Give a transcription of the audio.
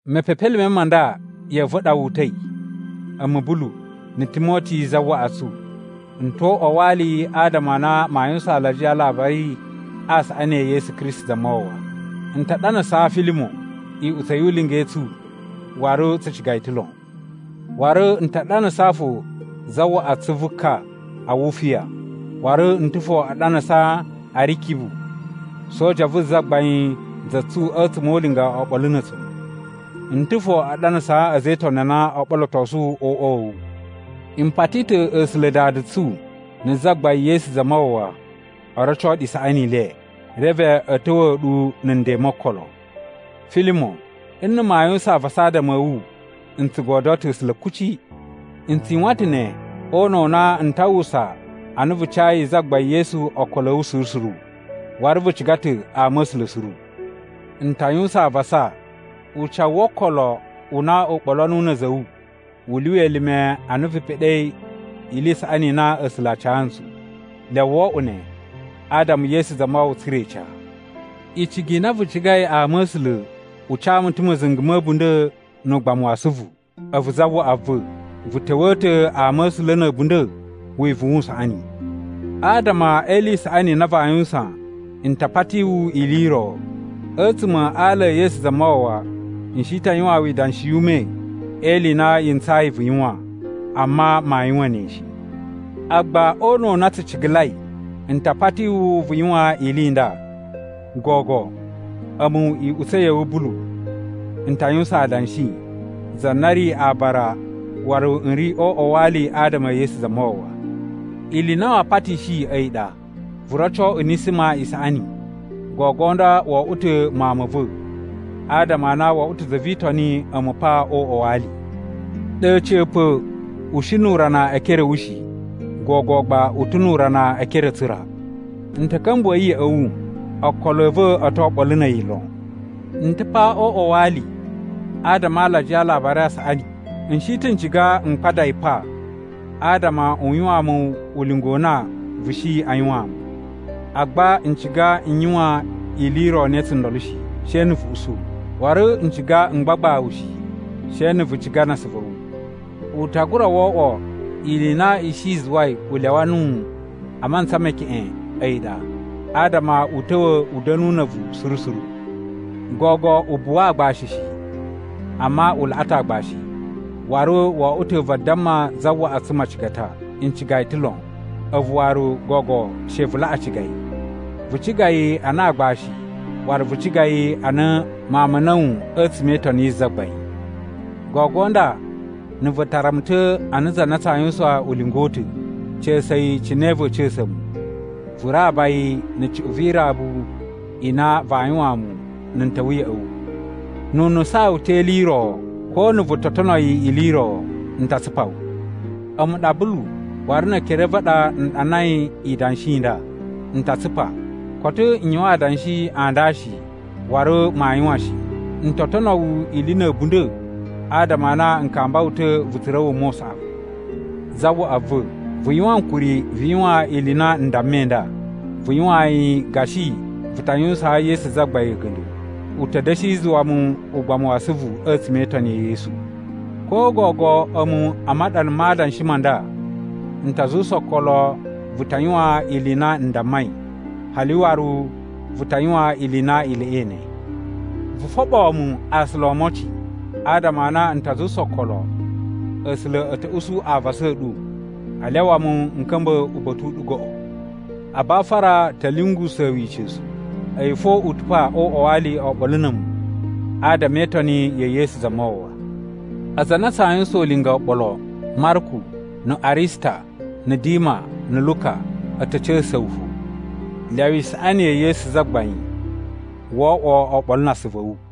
Mepepelime ma nda ya̱ꞌa̱ va̱ ɗa wu uta̱i, a̱mu Bulu, na̱ Timoti zawaꞌa tsu. N ta̱ o uꞌwa wa ali adama a na maa yuwusan alajiya a Alabari a Saꞌani e Yesu Kristi Zamawawa. N ta ɗanasaa Filimon iꞌutsa̱ yu ulinga i tsu, waru tsu ciga yi ta̱ lon. Waru n ta ɗanasaa fo zawaꞌa tsu vu ka Awufiya, waru n ta̱ fo a ɗanasaa Arikibu, soja vu Zagbain za tsu a̱tsuma̱ o ulinga oɓolo na̱ a̱tsu. N ta̱ fo a ɗanasaa a̱za̱ e Itoni a na oo ɓolotosu o uꞌwa wa̱ wu. M pati ta̱ A̱sula̱ Dada tsu na̱ Zagbain Yesu Zamawawa o roco ɗu isaꞌani i le, reve a̱ ta̱wa̱a̱ ɗu na̱ nden mo okolo. Filimon, nna̱ maa yuwusan avasa adama a̱ wu, n tsu godyo ta̱ A̱sula̱ kuci. N tsu yuwan ta̱ ne o una̱ u na n ta uwwusa a na vu cayi Zagbain Yesu okolo a̱ wu suru suru, waru vu ciga ta̱ ama a̱ A̱sula̱ suru. N ta yuwusan avasa ucawu wo okolo u na u ɓolo nuwu na̱ a̱za̱ a̱ wu u lyuwa elime a na vu peɗei ili i saꞌani i na A̱sula̱ a ca ntsu. Lyawa wo oꞌwo ne adama Yesu Zamawawa tsura̱ ica. Icigi i na vu cigai ama a̱ A̱sula̱ u ca mu ta̱ ma̱za̱nga̱ ma̱ a̱bunda̱ nu ugbamu wa asuvu. A̱vu, zawaꞌa va̱, vu ta̱wa̱a̱ ta̱ ama a̱ A̱sula̱ na̱ a̱bunda̱ wivuwun u saꞌani. Adama e ili i saꞌani i na vaa yuwusan n ta pati wu ili i ro. A̱tsuma̱ a ala e Yesu Zamawawa n shi ta yuwaan wu idanshi yu ume e ili i na yi ntsayi vu yuwan, amma maa yuwan ne shi. Agba, o una̱ u na tsu cigalai, n ta pati wu vu yuwan ili i nda. Gogo, a̱mu iꞌutsa̱ ya̱ wu, Bulu, n ta yuwusan adanshi, za na ri aabara waru n ri o uꞌwa wa ali adama e Yesu Zamawawa. Ili i na maa patishi a̱yi ɗa: vu roco Unisima isaꞌani. Gogo nda wo oꞌwo ta̱ mawun ma̱ va̱ adama a na wo oꞌwo ta̱ za vi Itoni a̱mu pa o uꞌwa wa ali. Ɗe a̱ca̱pa̱ u shi nu urana e ekere a̱ wu shi. Gogo gba u ta̱ nu urana e ekere a̱ tsu ra. N ta̱ ka̱mbuwa̱ yi ya̱ꞌa̱ wu, okolo a̱ va̱ o to oɓolo na̱ a̱yi lon. N ta̱ pa o uꞌwa wa ali adama a alajiya a Alabari a Saꞌani, n shi ta̱ n ciga m kpada yi pa adama u yuwaan mu ulinga u na vu shi a yuwaan mu. Agba n ciga n yuwan ili i ro ne tsundolo shi, she na̱ vu usu. Waru n ciga m gbagba wu shi, she na̱ vu ciga na asuvu a̱ wu. U ta gura wo oꞌwo ili i na i shi i zuwai u lyawa nuwu a mantsa me keꞌen a̱yi ɗa, adama u ta̱wa̱ u da̱nu na̱ a̱vu suru suru. Gogo u buwa aagbashi shi, amma u laꞌa ta̱ aagbashi, waru wo oꞌwo ta̱ vadamma zawaꞌa tsu macigata. N ciga yi ta̱ lon, a̱vu waru gogo she vu laꞌa ciga yi. Vu ciga yi ana aagbashi waru vu ciga yi ana mawun ma̱ a̱na̱wu a̱tsuma̱ e Itoni yi Zagbain. Gogo nda na̱ vu tara mu ta̱ ana za na tsaa yuwusan ulinga u ta̱, ca̱sa̱ yi cine va̱a̱ ca̱sa̱ mu, vu raba yi na̱ cuꞌun vi irabu i na vaa yuwaan mu na̱ n ta̱wa̱ ya̱ꞌa̱ wu. Nu u nusaan wu ta̱ e ili i ro, ko na̱ vu to tono yi ili i ro, n ta tsupa wu. A̱mu ɗa Bulu waru ne ekere a̱ va̱ a ɗa n ɗanai idanshi i nda, “N ta tsupa.” Koto n yuwan adanshi a nda shi waru maa yuwan shi, n to tono wu ili na̱ a̱bunda̱ adama a na n kamba wu ta̱ vu tsura̱ wuma u saꞌavu! Zawaꞌa va̱, vu yuwan ankuri vu yuwan ili i na n dammai nda, vu yuwaan yi gashi vu ta yuwusaan Yesu Zagbain a̱ga̱nda̱. U ta̱ da̱shi zuwa mu ugbamu wa asuvu a̱tsuma̱ e Itoni ya̱ Yesu. Ko gogo a̱mu a maɗana ma adanshi ma nda n ta zuwusa okolo vu ta yuwan ili i na n dammai, hali waru vu ta yuwan ili i na i laꞌai ne! Vu foɓoo mu aasula o omocin, adama a na n ta zuwusa okolo A̱sula̱ a̱ ta̱ usu avasa a̱ ɗu a lyawa mu n ka̱mba̱ uba̱ta̱ u ɗu goꞌo. Abafara ta̱ lyungusa̱a̱ wu ica̱su. A̱yi fo u ta̱ pa o uꞌwa wa ali oɓolo na̱ a̱mu adama e itoni ya̱ Yesu Zamawawa. Aza a na tsaa yuwusan ulinga oɓolo, Marku na̱ Arista, na̱ Dima, na̱ Luka, a̱ ta̱ ca̱sa̱sa̱ wu fo. Lyawa isaꞌani ya̱ Yesu Zagbain wo oꞌwo oɓolo na asuvu a̱ wu.